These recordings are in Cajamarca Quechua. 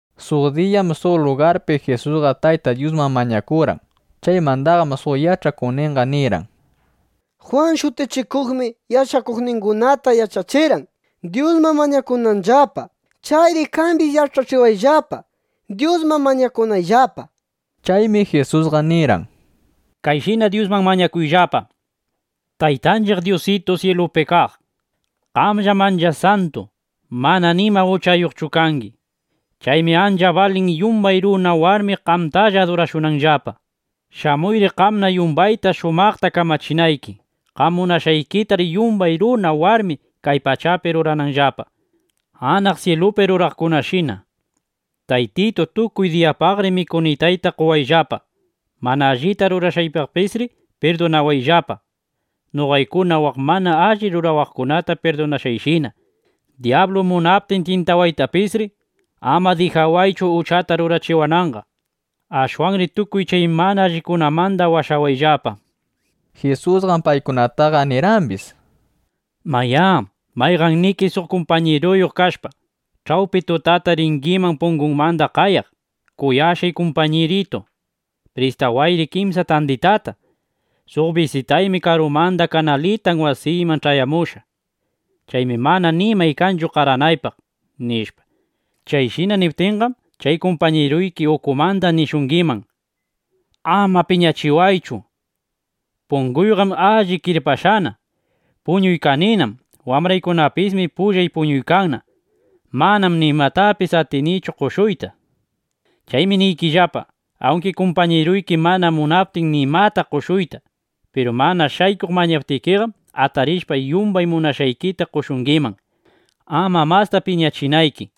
Suq diyam suq lugarpi Jisusqa Tayta Dyusman mañakurqan. Chaymandaqam suq yach'akuqninqa nirqan: —Jwan Shutichikuqmi yach'akuqningunata yach'achirqan, Dyusman mañakunanllapa. Chayri qambis yach'achiwayllapa, Dyusman mañakunayllapa, nishpa. Chaymi Jisusqa nirqan: —Kayshina Dyusman mañakuyllapa: Taytanchiq Dyusitu ˻syilupi kaq˼, qamllam ancha santu, mana nima uchayuqchu kangi. Chaymi ancha balin, yumbay runa warmi qamtalla adurashunanllapa. Shamuyri, qamna yumbayta shumaqta kamachinayki. Qam munashqaykitar yumbay runa, warmi kay pachapi ruranqallapa, anaq syilupi ruraqkunashina. Taytitu, tukuy diyapaqri mikunitayta qowayllapa. Mana allita rurashqaytapisri pirdunawayllapa, noqaykuna waq mana alli rurawaqkunata pirdunashqayshina. Dyablu munaptin tyintawaytapisri, ama dijaychu uchata rurachiwananqa. Ashwanri tukuy chay mana allikunamanda washawayllapa, nishpa. Jisusqam paykunataqa nirqambis: —Mayá, mayqanniki suq kumpañiruyuq kashpa, ch'awpi tutata ringiman pungunmanda qayaq: “Kuyashqay kumpañiritu, pristawayri kimsa tanditata. Suq bisitaymi karumanda kanalitan wasiyman ch'ayamushqa. Chaymi mana nimay kanchu qaranaypaq”, nishpa. Chayshina niptikiqam, chay kumpañiruyki ukumanda nishungiman: “¡Ama piñachiwaychu! Punguyqam alli kirpashqana. Puñuykaninam. Wambraykunapismi pullay puñuykanna. Manam nimatapis atinichu qoshuyta”, nishpa. Chaymi niykillapa, awnki kumpañiruyki mana munaptin nimata qoshuyta, piru mana shaykuq mañaptikiqam, atarishpa yumbay munashqaykita qoshungiman, ama masta piñachinayki.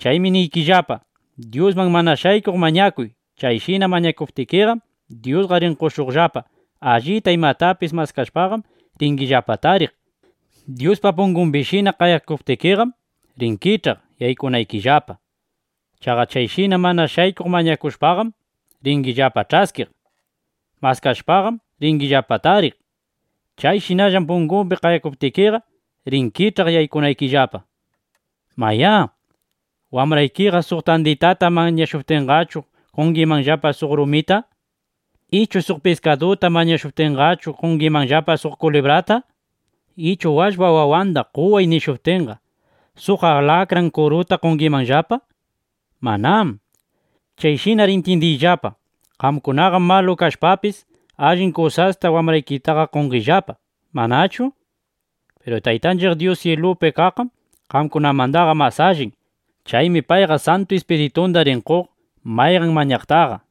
Chaymi niykillapa, Dyusman (mana shaykuq) mañakuy. Chayshina mañakuptikiqam, Dyusqa rin qoshuqllapa. Allita imatapis maskashpaqam, ringillapa tariq. Dyuspa pungumbishina qayakuptikiqam, rin kich'aq yaykunaykillapa. Chaqa chayshina (mana shaykuq) mañakushpaqam, ringillapa ch'askiq. Maskashpaqam, ringillapa tariq. Chayshinallam pungupi qayakuptikiqa, rin kich'akaq yaykunaykillapa. ’¿Mayá, wambraykiqa suq tanditata mañashuptinqachu, qongimanllapa suq rumita? ¿Ichu suq piskaduta mañashuptinqachu, qongimanllapa suq kulibrata? ¿Ichu, “Wallpap wawanda qoway”, nishuptinqa, suq atallki kuruta (alakran kuruta) qongimanllapa? Manám. Chayshinar intyindiyllapa, qamkunaqam malu kashpapis, allin kusasta wambraykitaqa qongillapa, ¿manachu? Piru Taytanchiq Dyus syilupi kaqqam qamkunamandaqa mas allin. Chaymi payqa Santu Ispiritunda rin qoq mayqan mañaqtaqa.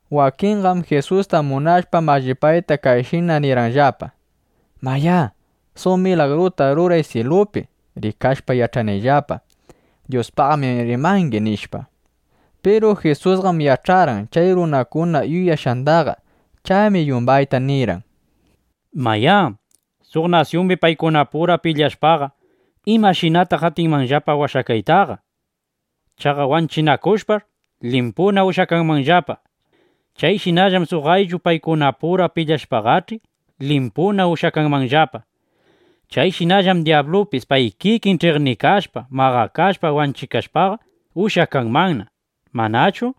Wakinqam Jisusta munashpa mallipayta, kayshina nirqanllapa: —Mayá, suq milagruta ruray syilupi, rikashpa yach'anayllapa: Dyuspaqmi rimangi, nishpa. Piru Jisusqam yach'arqan chay runakuna yuyashqandaqa. Chaymi yumbayta nirqan: —Mayá, suq nasyumbi paykunapura pilyashpaqa, ¿imanaytaq atinmanllapa kawsaytaqa? Chaqa wanchinakushpash', limpuna ushyakanmanllapa. Chayshinallam suq ayllu, paykunapura pilyashpaqach'i, limpuna ushyakanmanllapa. Chayshinallam dyablupis pay kikin ch'iqnikashpa maqakashpa wanchikashpaqa, ushyakanmanna, ¿manachu?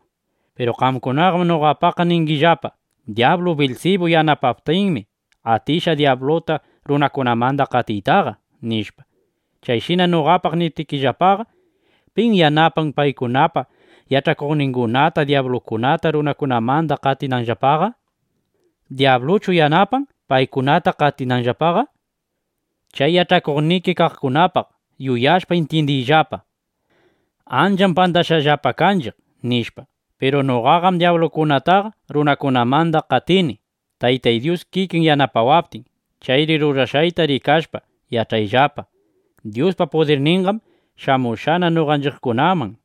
Piru qamkunaqam noqapaq ningillapa: “Dyablu Bilsibu yanapaptinmi, atishqa dyabluta runakunamanda qatiytaqa”, nishpa. Chayshina noqapaq niptikillapaqa, ¿pim yanapan qamkunapa yach'akuqnikikunata, dyablukunata runakunamanda qatinanllapaqa? ¿Dyabluchu yanapan paykunata qatinanllapaqa? Chay yach'akuqniki kaqkunapaq yuyashpa, intyindiyllapa: Ancham pandashqallapa kanchiq, nishpa. Piru noqaqam dyablukunataqa runakunamandaqa qatini, Taytay Dyus kikin yanapawaptin. Chayri rurashqayta rikashpa, yach'ayllapa: Dyuspa pudirninqam shamushqana noqanchiqkunaman, nishpa.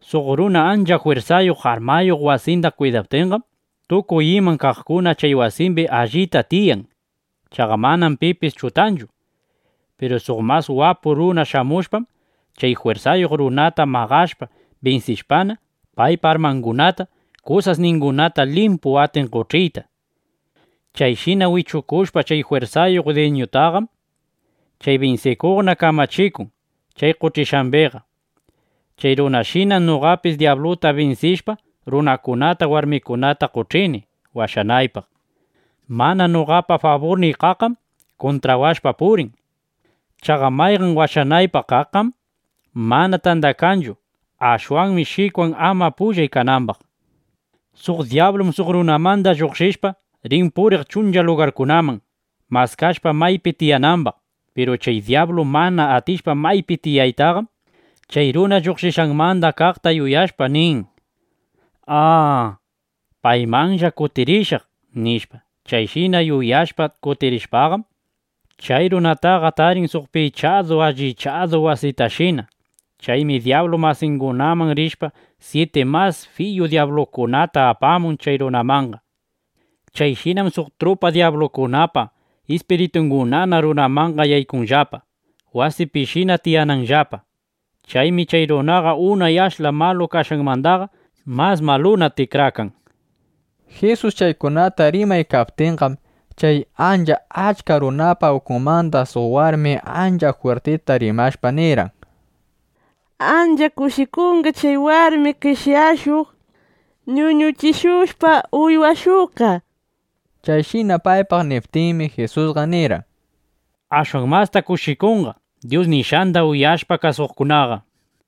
’Suq runa ancha jwirsayuq, armayuq wasinda kwidaptinqam, tukuy iman kaqkuna chay wasimbi allita tiyan. Chaqa manam pipis chutanchu. Piru suq mas wapu runa shamushpam, chay jwirsayuq runata maqashpa binsishpana, paypa armangunata, kusasningunata limpu atin qoch'iyta. Chayshina wichukushpa chay jwirsayuq dwiñutaqam, chay binsikuqna kamachikun chay qoch'ishqambiqa. (Chay runashinam noqapis dyabluta binsishpa, runakunata, warmikunata qoch'ini washanaypaq.) ’Mana noqapa faburniy kaqqam kuntrawashpa purin. Chaqa mayqan washanaypaq kaqmanqam mana tandakanchu. Ashwanmi shikwan, ama pullay kanambaq. ’Suq dyablum suq runamanda lluqshishpa, rin puriq chuncha lugarkunaman, maskashpa maypi tiyanambaq. Piru chay dyablu mana atishpa maypi tiyaytaqam, chay runa lluqshishqanmanda kaqta yuyashpa, nin: “¡A, paymanlla kutirishaq!” nishpa. Chayshina yuyashpa kutirishpaqam, chay runataqa tarin suq pichadu allichadu wasitashina. Chaymi dyablu masingunaman rishpa, syiti mas fiyu dyablukunata apamun chay runamanqa. Chayshinam suq trupa dyablukunapa ispiritungunana runamanqa yaykunllapa, wasipishina tiyananllapa. Chaymi chay runaqa unay ashla malu kashqanmandaqa mas maluna tikrakan. Jisus chaykunata rimaykaptinqam, chay ancha achka runakunapa ukunmanda suq warmi ancha jwirtita rimashpa nirqan: —¡Ancha kushikunqa chay warmi qeshyashuq, ñuñuchishushpa uywashuqqa! nishpa. Chayshina paypaq niptinmi, Jisusqa nirqan: —Ashwan masta kushikunqa Dyus nishqanda uyashpa kasuqkunaqa, nishpa.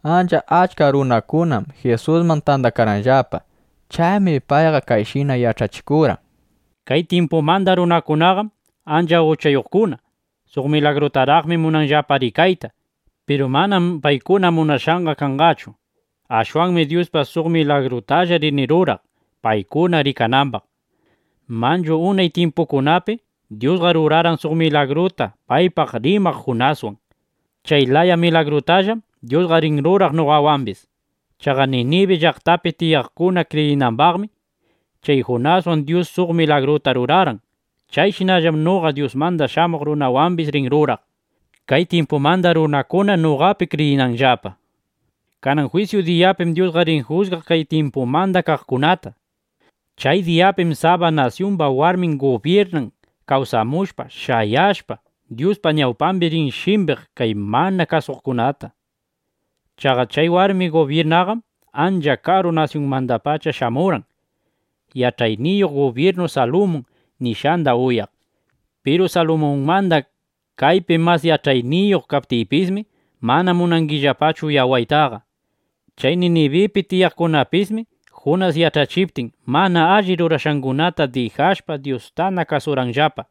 Ancha achka runakunam Jisusman tandakarqanllapa. Chaymi payqa kayshina yach'achikurqan: —Kay tyimpumanda runakunaqam ancha uchayuqkuna. Suq milagrutaraqmi munanllapa rikayta. Piru manam paykuna munashqanqa kanqachu. Ashwanmi Dyusqa suq milagrutalla rin ruraq, paykuna rikanambaq. Manchu unay tyimpukunapi Dyusqa rurarqan suq milagruta paypaq rimaq Junaswan. Chay laya milagrutallam Dyusqa rin ruraq noqawambis. Chaqa Ninibi llaqtapi tiyaqkuna kriyinambaqmi, chay Junaswan Dyus suq milagruta rurarqan. Chayshinallam noqa Dyusmanda Shamuq Runawambis rin ruraq, kay tyimpumanda runakuna noqapi kriyinanllapa. Kanan jwisyu diyapim Dyusqa rin jusgaq kay tyimpumanda kaqkunata. Chay diyapim Saba nasyumba warmi gubyirnan kawsamushpa, shayashpa, Dyuspa ñawpambi rin shimbiq kay mana kasuwaqkunata. Chaqa chay warmi gubyirnaqam ancha karu nasyunmandapacha shamurqan, yach'ayniyuq gubyirnu Salumun nishqanda uyaq. Piru Salumunmanda kaypi mas yach'ayniyuq kaptiypismi, mana munangillapachu uyawaytaqa. Chay Ninibipi tiyaqkunapismi Junas yach'achiptin, mana alli rurashqangunata dijashpa, Dyustana kasurqanllapa.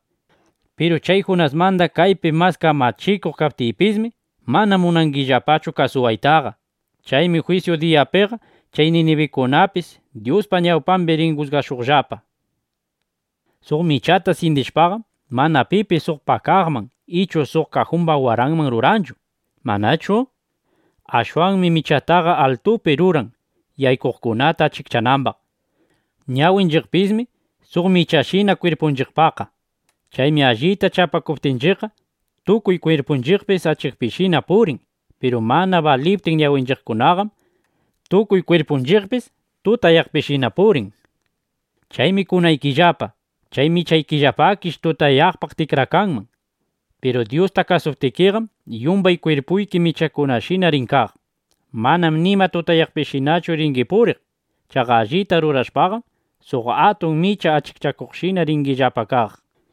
Piru chay Junasmanda kaypi mas kamachikuq kaptiypismi, mana munangillapachu kasuwaytaqa. Chaymi jwisyu diyapiqa chay ninibinukunapis Dyuspa ñawpambi rin jusgashuqllapa. ’Suq michata syindishpaqam, mana pipis suq pakaqman ichu suq kajumba waranman ruranchu, ¿manachu? Ashwanmi michataqa altupi ruran, yaykuqkunata achikchanambaq. Ñawinchiqpismi suq michashina kwirpunchiqpaqqa. Chaymi allita chapakuptinchiqqa, tukuy kwirpunchiqpis achikpishina purin. Piru mana baliptin ñawinchiqkunaqam, tukuy kwirpunchiqpis tutayaqpishina purin. Chaymi kunaykillapa, chay michaykillapakish tutayaqpaq tikrakanman. Piru Dyusta kasuptikiqam, yumbay kwirpuyki michayuqshina rin kaq. Manam nima tutayaqpishinachu ringi puriq. (Chaqa allita rurashpaqam, suq atun micha achikchakuqshina ringillapa kaq.)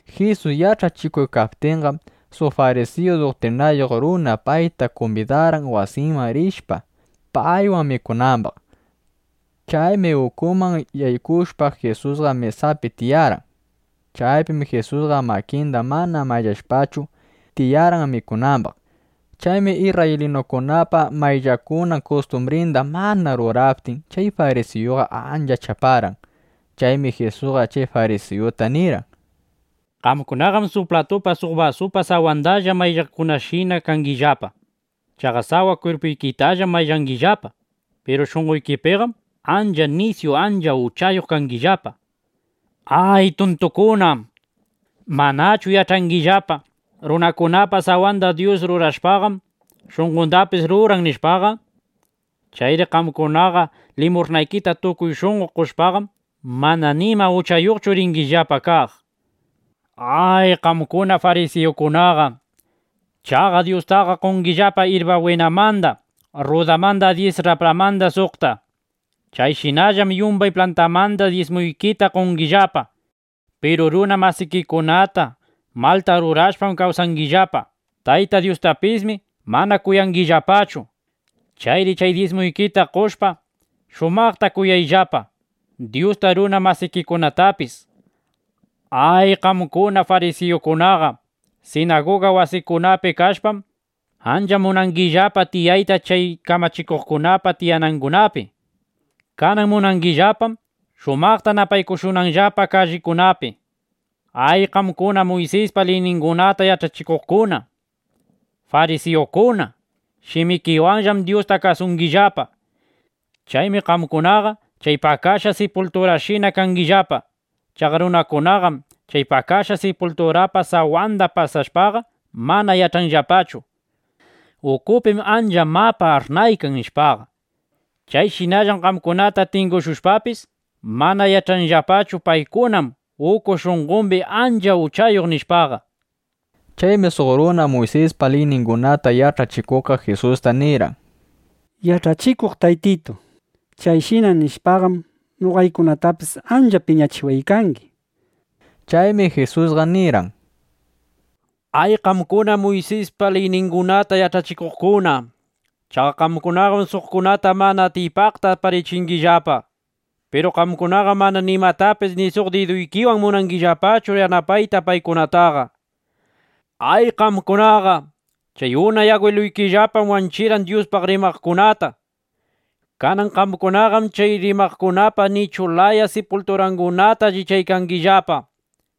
Jisus yach'achikuptinqam, suq farisiyu duktrinayuq runa payta kumbidarqan, wasinman rishpa, paywan mikunambaq. Chaymi ukuman yaykushpa, Jisusqa mesaman tiyarqan. Chaypim Jisusqa makinda mana mayllashpachu, tiyarqan mikunambaq. Chaymi isrraylinukunapa mayllakunan kustumbrinda mana ruraptin, chay farisiyuqa ancha chaparqan. Chaymi Jisusqa chay farisiyuta nirqan: —Qamkunaqam suq platupa suq basupa sawandalla maylladukunashina kangillapa. Chaqa sawa kwirpuykitallam mayllangillapa. Piru shunqoykipiqam ancha nisyu ancha uchayuq kangillapa. ¡Ay, tuntukuna! ¿Manachu yach'angillapa, runakunapa sawanda Dyus rurashpaqam, shunqondapis rurarqan, nishpaqa? Chayri qamkunaqa limush'naykita tukuy shunqo qoshpaqam, mana nima uchayuqchu ringillapa kaq. ’¡Ay qamkuna farisiyukunaqa! Chaqa Dyustaqa qongillapa irba bwinamanda, rrudamanda dyis rapranmanda suqta. Chayshinallam yumbay plantamanda dyismuykita qongillapa. Piru runa masikikunata malta rurashpam kawsangillapa. Tayta Dyustapismi mana kuyangillapachu. Chayri chay dyismuykita qoshpa, shumaqta kuyayllapa Dyusta, runa masikikunatapis. ’¡Ay qamkuna farisiyukunaqa! Sinaguga wasikunapi kashpaqam, ancha munangillapa tiyayta chay kamachikuqkunapa tiyanangunapi. Kanan munangillapam, shumaqta napaykushunanllapa kallikunapi. ’¡Ay, qamkuna Muysispa liyningunata yach'achikuqkuna, farisiyukuna! Shimikiwanllam Dyusta kasungillapa. Chaymi qamkunaqa chay pakashqa sipulturashina kangillapa. Chaqa runakunaqam chay pakashqa sipulturapa sawanda pasashpaqa, mana yach'anllapachu: (Ukupim ancha mapa ash'naykan, nishpaqa. Chayshinallam qamkunata tingushushpapis, mana yach'anllapachu: Paykunam uku shunqombi ancha uchayuq, nishpaqa.) Chaymi suq runa Muysispa liyningunata yach'achikuqqa Jisusta nirqan: —Yach'achikuq Taytitu, chayshina nishpaqam, noqaykunatapis ancha piñachiwaykangi, nishpa. Chaymi Jisusqa nirqan: —¡Ay qamkuna Muysispa liyningunata yach'achikuqkuna! Chaqa qamkunaqam suqkunata mana atiypaqta aparichingillapa. Piru qamkunaqam mana nimatapis ni suq diduykiwan munangillapachu yanapayta paykunataqa. ’¡Ay qamkunaqa! Chay unay agwiluykillapam wanchirqan Dyuspaq rimaqkunata. Kanan qamkunaqam chay rimaqkunapa nichu laya sipulturangunata allichangillapa.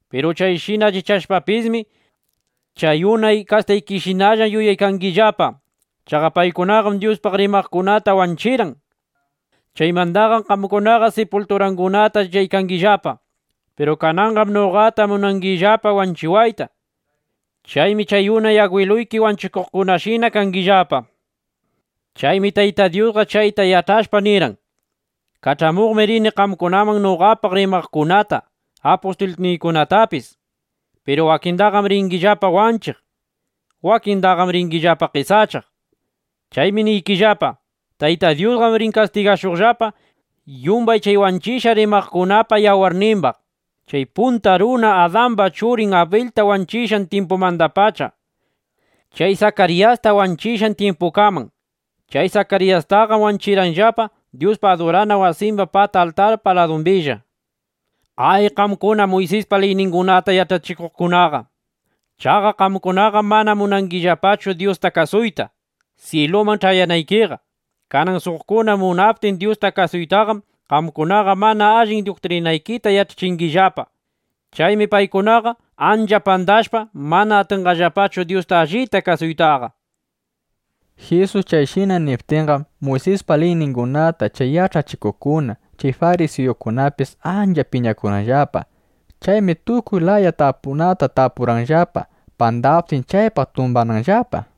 Piru chayshina allichashpapismi, chay unay kastaykishinalla yuyaykangillapa. Chaqa paykunaqam Dyuspaq rimaqkunata wanchirqan. Chaymandaqam qamkunaqa sipulturangunata allichangillapa. (Piru kananqam noqata munangillapa wanchiwayta. Chaymi chay unay agwiluyki wanchikuqkunashina kangillapa). Chaymi Tayta Dyusqa chayta yach'ashpa nirqan: “Kach'amuqmi rini qamkunaman noqapaq rimaqkunata, apustulniykunatapis. Piru wakindaqam ringillapa wanchiq; wakindaqam ringillapa qesachaq”, nishpa. Chaymi niykillapa, Tayta Dyusqam rin kastigashuqllapa yumbay chay wanchishqa rimaqkunapa yawarnimbaq, chay punta runa Adamba churin Abilta wanchishqan tyimpumandapacha chay Sakariyasta wanchishqan tyimpukaman. Chay Sakariyastaqam wanchirqanllapa Dyuspa adurana wasimba pata altarpa ladumbilla. ’¡Ay qamkuna Muysispa liyningunata yach'achikuqkunaqa! Chaqa qamkunaqam mana munangillapachu Dyusta kasuyta, syiluman ch'ayanaykiqa. Kanan suqkuna munaptin Dyusta kasuytaqam, qamkunaqa mana allin duktrinaykita yach'achingillapa. Chaymi paykunaqa ancha pandashpa, mana atinllapachu Dyusta allita kasuytaqa. Jisus chayshina niptinqam, Muysispa liyningunata chay yach'achikuqkuna, chay farisiyukunapis ancha piñakurqanllapa. Chaymi tukuy laya tapunata tapurqanllapa, pandaptin, chaypaq tumbananllapa.